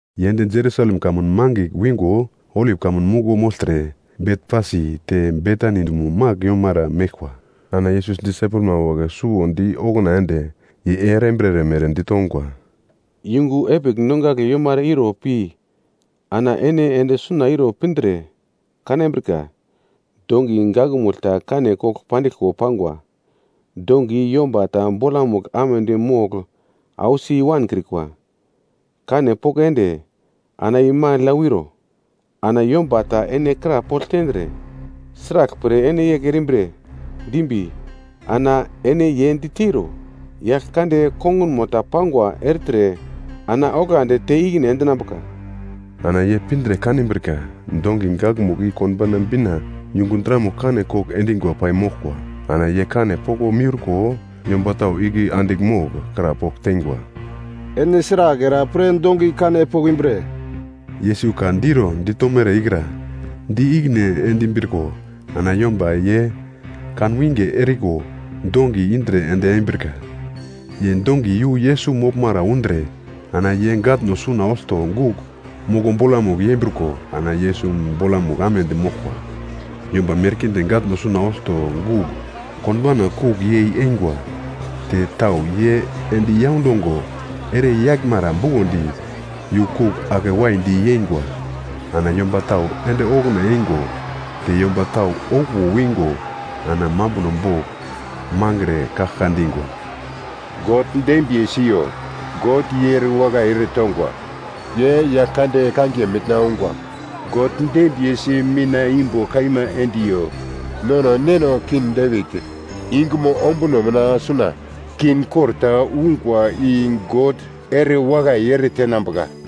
Ye ende Jerusalem kamun mangigl wingo Olip Kamun Muglo mogltre Betfasi te Betani dumo magl yomara meglkwa. Ana Yesus disaipelma wagle suwo di okuna ende, ye erambirere mere ditongwa, “Yungu epigl nongagle yomara iro pi ana ene ende suna iro pindre kanambrika, dongi gakmugl ta kane kogl pandiglko pangwa. Dongi i yomba ta bolamugl amedi mogl ausi i-wankrikwa. Kane poko ende, ana i magl ya wiro. Ana yomba ta ene krapogl tendre, ‘Sraglpre ene yegl erimbre?’ dimbi, ana ene ye diteiro, ‘Yaglkande kongunmo ta pangwa ertre, ana oglandi te ikine endinambuka.’” Ana ye pindre kanbrika dongi gakmugl i konbauna bina, yungu dramugl kane kogl endingwa pai moglkwa. Ana ye kane poko miurko, yomba tau igle andigl mogl krapogl teingwa, “Ene sragl era pre dongi kane pokimbre?” Yesus ka diro ditomere ikra di ikine endimbriko ana yomba ye kanwinge eriko dongi indre ende embrika. Ye dongi yu Yesus moglmara undre ana ye gatno suna olto gugl moko bolamugl yembriko ana Yesus bolamugl amedi moglkwa. Yomba merkinde gatno suna olto gugl konbauna kugl yei eingwa. Te tau ye endi yaundongo ere yaglmara bukondi yu kugl ake waidi yeingwa. Ana yomba tau ende okuna eingo te yomba tau okuwo wingo ana mambuno bogl mangre kaglka dingwa, “God dembiye siyo!” “God ye erewakai ere tongwa, ye Yaglkande kangiye mina ungwa!” “God dembiyesi mitna imbo kaima endiyo! Nono neno King Devit yungumo ombuno mina suna, king kor ta ungwa i God erewakai ere tenambuka!”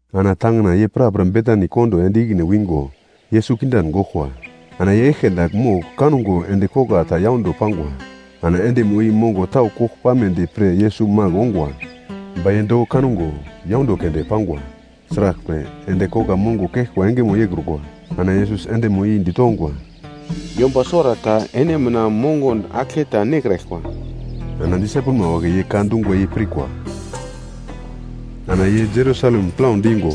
Ana tangina ye prapra Betani kondo ende ikine wingo, Yesus kindan goglkwa. Ana ye eglke dagl mogl kango endi kogla ta yaundo pangwa, ana endimo i mongo tau kogl pamedi pre Yesus magl ongwa. Ba ye doko kango, yaundo keunde pangwa. Sraglpre, endi kogla mongo keglkwa engemo yeikrukwa. Ana Yesus endimo i ditongwa, “Yomba suwarata ene mina mongon aglketa nekraglkwa.” Ana disaipelma wagle ye ka dungwa i pirkwa. Ana ye Jerusalem plau dingo,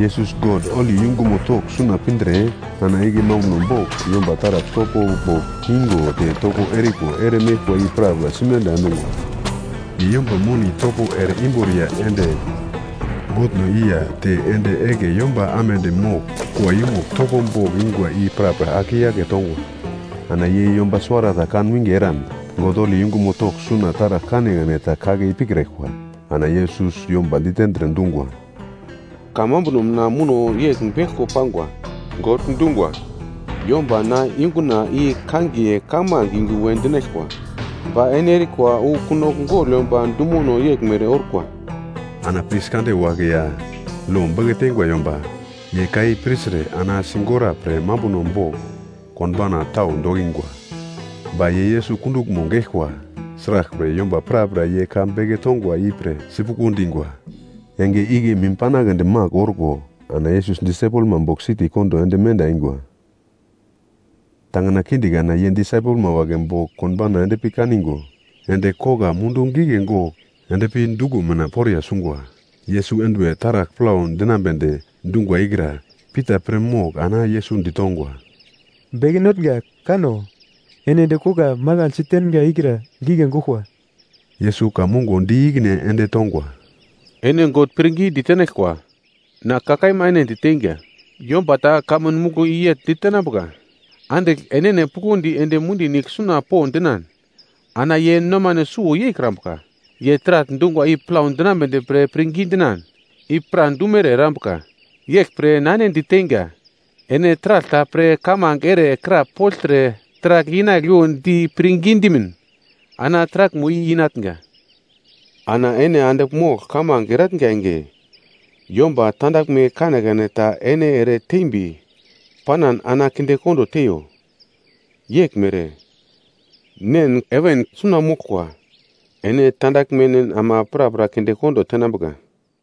Yesus God holi yungumo togl suna pindre ana igle mambuno bogl yomba taragl topo bogl ingo te topo eriko ere meglkwa i prapra simenda endungwa. Ye yomba moni topo ere imboriya ende botno i ya te ende egle yomba amedi mogl kua yumugl topo bogl ingwa i prapra ake i-yake tongwa. Ana ye yomba suwarata kan winge eran God holi yungumo togl suna taragl kanekane ta kake ipikraglkwa. Ana Yesus yomba ditendre dungwa, “Kamambuno mina muno yegl beglko pangwa. God dungwa, “‘Yomba na yunguna i kangiye kamange yungu we dinaglkwa.’ Ba ene erikwa wu ‘kunogl gogl yomba dumono’ yeglmere orkwa.” Ana pris kande wagle ya lo beke teingwa yomba ye ka i pirtre ana sigora pre mambuno bogl konbauna tau dokingwa. Ba ye Yesus kunduglmo geglkwa. Sraglpre yomba prapra ye ka beke tongwa ipre sipuglo dingwa. Enge igle mim panagledi magl orko ana Yesus disaipelma bogl siti kondo ende menda eingwa. Tangina kinde kana ye disaipelma wagle bogl konbauna endpi kaningo, endi kogla mundu gigle gogl endpi duglo mina poriya sungwa. Yesus enduwe taragl plau dinambe dungwa ikra Pita pir mogl ana Yesus ditongwa, “Beke Notnga, kano! Ene endi kogla mangaglsi tengra ikra gigle goglkwa.” Yesus ka mongo di ikine ende tongwa, “Ene God pirngi ditenaglkwa. Na ka kaima ene diteinga, yomba ta kamun muglo i yegl ditenambuka, andigl enene puglondi ende mundi nigle suna po dinan, ana ye nomane suwo yeikrambuka. Ye taragl dungwa i plau dinambedi pre pirngi dinan, i pradumere erambuka. Yeglpre na ene diteinga, ene taragl ta pre kamange ere krapogltre taragl inagliwo di pirngi dimin, ana taraglmo i inatnga. Ana ene andigl mogl kamange eratnga enge, yomba tandaglme kanekane ta ene ere tembi panan ana kindekondo teiyo. Yeglmere Nen heven suna moglkwa, ene tandaglmen ama prapra kinde kondo tenambuka.”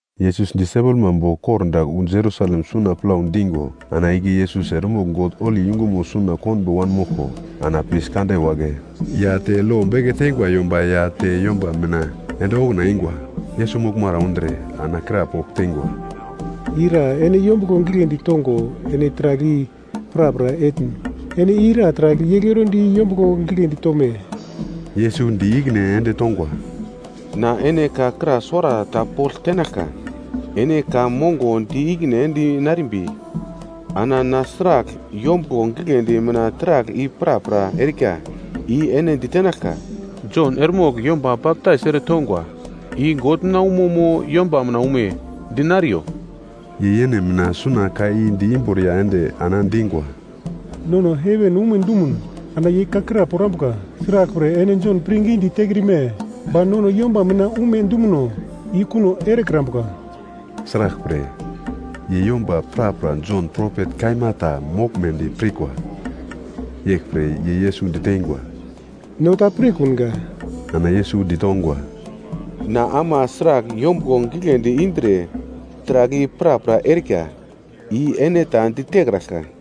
Yesus disaipelma bogl kordagl wu Jerusalem suna plau dingo ana igle Yesus eremogl God holi yungumo suna konbo wanmoglko, ana pris kande wagle ya te lo beke teingwa yomba ya te yomba mina ende okuna eingwa, Yesus moglmara undre, ana krapogl teingwa, “Ira ene yombuglo gigledi tongo ene taragl i prapra etn? Ene ira taragl yegl erondi yombuglo gigledi tome?” Yesus di ikine ende tongwa, “Na ene ka kra suwarata pogl tenaglka. Ene ka mongo di ikine ende narimbi ana na sragl yombuglo gigledi mina taragl i prapra erika, i ene ditenaglka. Jon eremogl yomba baptais ere tongwa i God mina umo mo, yomba mina ume? Dinariyo!” Ye yene mina suna ka i di imboriya ende ana dingwa, “Nono heven ume dumun, ana ye ka kra porambuka, ‘Sraglpre ene Jon pirngidi tekrime?’ Ba nono yomba mina ume dumuno i kuno erekrambuka.” (Sraglpre, ye yomba prapra Jon propet kaima ta moglmedi pirkwa.) Yeglpre ye Yesus diteingwa, “No ta pirkunga.” Ana Yesus ditongwa, “Na ama sragl yombuglo gigledi indre taragl i prapra erika, i ene ta ditekraglka.”